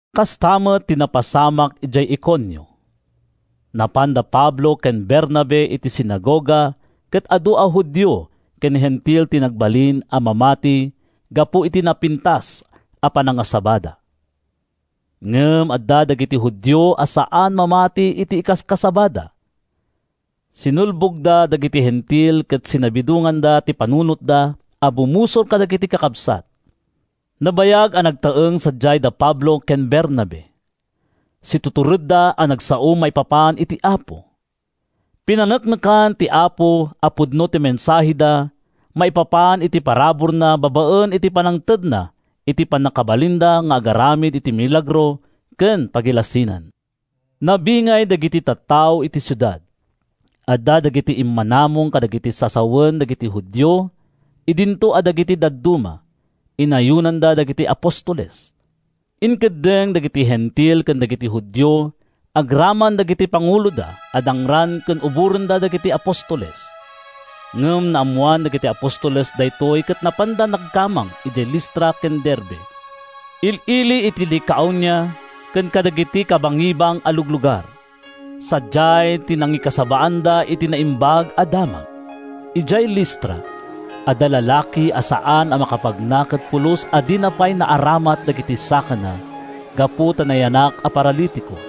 Kasta met ti napasamak idiay Iconio. Napan da Pablo ken Bernabe iti sinagoga ket adu a Judio ken Hentil ti nagbalin a mamati gapu iti napintas a panangasabada. Ngem adda dagiti Judio a saan a mamati iti ikaskasabada. Sinulbogda dagiti Hentil ket sinabidonganda ti panunotda a bumusor kadagiti kakabsat. Nabayag a nagtaeng sadiay da Pablo ken Bernabe. Situturedda a nagsao maipapan iti Apo. Pinaneknekan ti Apo a pudno ti mensaheda maipapan iti paraburna babaen iti pannangtedna iti pannakabalinda nga agaramid iti milagro ken pagilasinan. Nabingay dagiti tattao iti siudad: Adda dagiti immanamong kadagiti sasawen dagiti Judio idinto a dagiti dadduma, inayonanda dagiti apostoles. Inkeddeng dagiti Hentil ken dagiti Judio agraman dagiti panguloda a dangran ken uborenda dagiti apostoles. Ngem naammoan dagiti apostoles daytoy ket napanda nagkamang idiay Listra ken Derbe, il-ili iti Licaonia, ken kadagiti kabangibang a luglugar. Sadiay ti nangikasabaanda iti Naimbag a Damag. Idiay Listra, adda lalaki a saan a makapagna ket pulos a dina pay naaramat dagiti sakana gapu ta nayanak a paralitiko.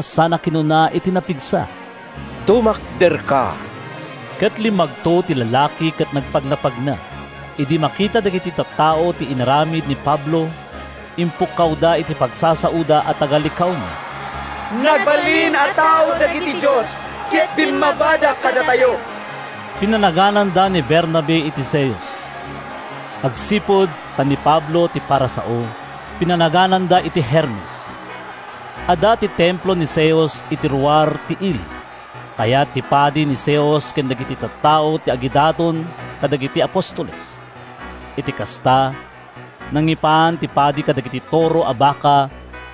sana kinuna iti napigsa, “Tumakderka!” Ket limmagto ti lalaki ket nagpagnapagna. Idi makita dagiti tattao ti inaramid ni Pablo, impukkawda iti pagsasaoda a taga-Licaonia, “Nagbalin a tao dagiti dios ket bimmabada kadatayo!” Pinanagananda ni Bernabe iti Zeus. Agsipud ta ni Pablo ti para sao, pinanagananda iti Hermes. Adda ti templo ni Zeus iti ruar ti ili. Kayat ti padi ni Zeus ken dagiti tattao ti agidaton kadagiti apostoles. Iti kasta, nangipan ti padi kadagiti toro a baka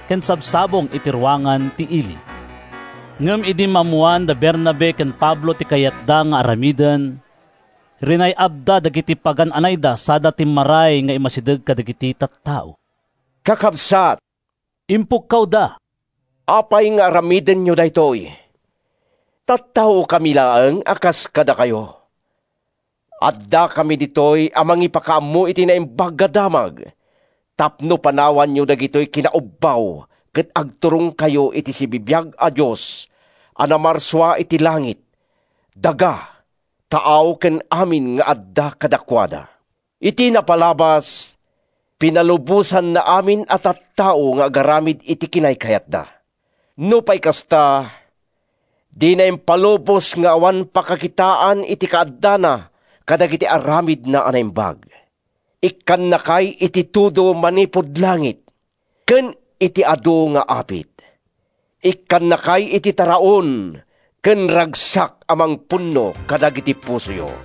ken sabsabong iti ruangan ti ili. Ngem idi maammoan da Bernabe ken Pablo ti kayatda nga aramiden, rinay-abda dagiti pagan-anayda sada timmaray nga immasideg kadagiti tattao. “Kakabsat,” impukkawda, “apay nga aramidenyo daytoy? Tattaokami laeng a kas kadakayo. Addakami ditoy a mangipakaammo iti Naimbag a Damag tapno panawanyo dagitoy a kinaubbaw ket agturongkayo iti sibibiag a Dios a namarsua iti langit, daga, taaw ken amin nga adda kadakuada. Iti napalabas, pinalubosanna amin a tattao nga agaramid iti kinaykayatda. Nupay kasta, dina impalubos nga awan pakakitaan iti kaaddana kadagiti aramidna a naimbag: Ikkannakay iti tudo manipud langit ken iti adu nga apit; ikkannakay iti taraon ken ragsak a mangpunno kadagiti pusoyo.”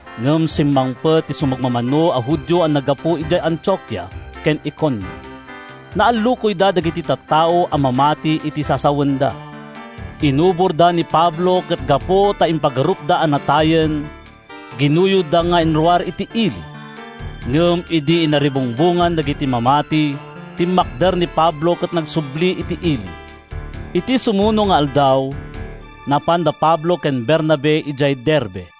Ngem simmangpet ti sumagmamano a Judio a naggapu idiay Antiokia ken Iconio. Naallukoyda dagiti tattao a mamati iti sasawenda. Inuborda ni Pablo ket gapu ta impagarupda a natayen, ginuyodda nga inruar iti ili. Ngem idi inaribungbongan dagiti mamati, timmakder ni Pablo ket nagsubli iti ili. Iti sumuno nga aldaw, napan da Pablo ken Bernabe idiay Derbe.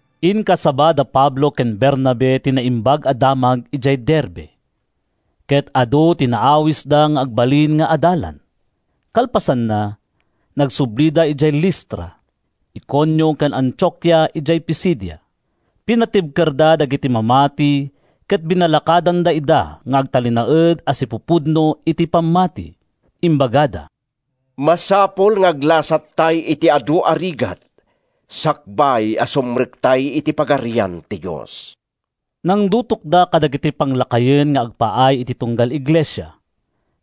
Inkasaba da Pablo ken Bernabe ti Naimbag a Damag idiay Derbe, ket adu ti naawisda nga agbalin nga adalan. Kalpasanna, nagsublida idiay Listra, Iconio ken Antiokia idiay Pisidia. Pinatibkerda dagiti mamati ket binalakadanda ida nga agtalinaed a sipupudno iti pammati. Imbagada, “Masapul nga aglasattay iti adu a rigat sakbay a sumrektay iti Pagarian ti Dios.” Nangdutokda kadagiti panglakayen nga agpaay iti tunggal iglesia,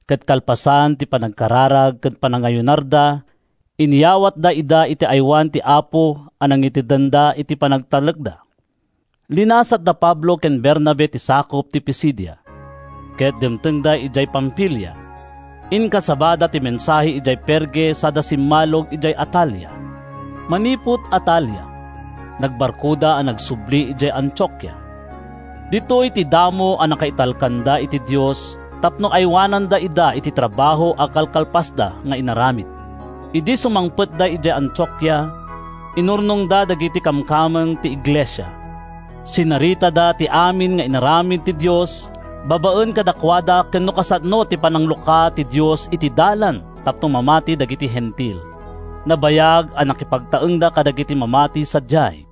ket kalpasan ti panagkararag ken panagayunarda, inyawatda ida iti aywan ti Apo a nangitedanda iti panagtalekda. Linasat da Pablo ken Bernabe ti sakup ti Pisidia, ket dimtengda idiay Pamfilia. Inkasabada ti mensahe idiay Perge sada simmalog idiay Atalia. Manipud Atalia, nagbarkoda a nagsubli idiay Antiokia. Ditoy ti damo a nakaitalkanda iti Dios tapno aywananna ida iti trabaho a kalkalpasda nga inaramid. Idi sumangpetda idiay Antiokia, inurnongda dagiti kamkameng ti iglesia. Sinaritada ti amin nga inaramid ti Dios babaen kadakuada ken no kasano ti pananglukat ti Dios iti dalan tapno mamati dagiti Hentil. Nabayag a nakipagtaengda kadagiti mamati sadiay.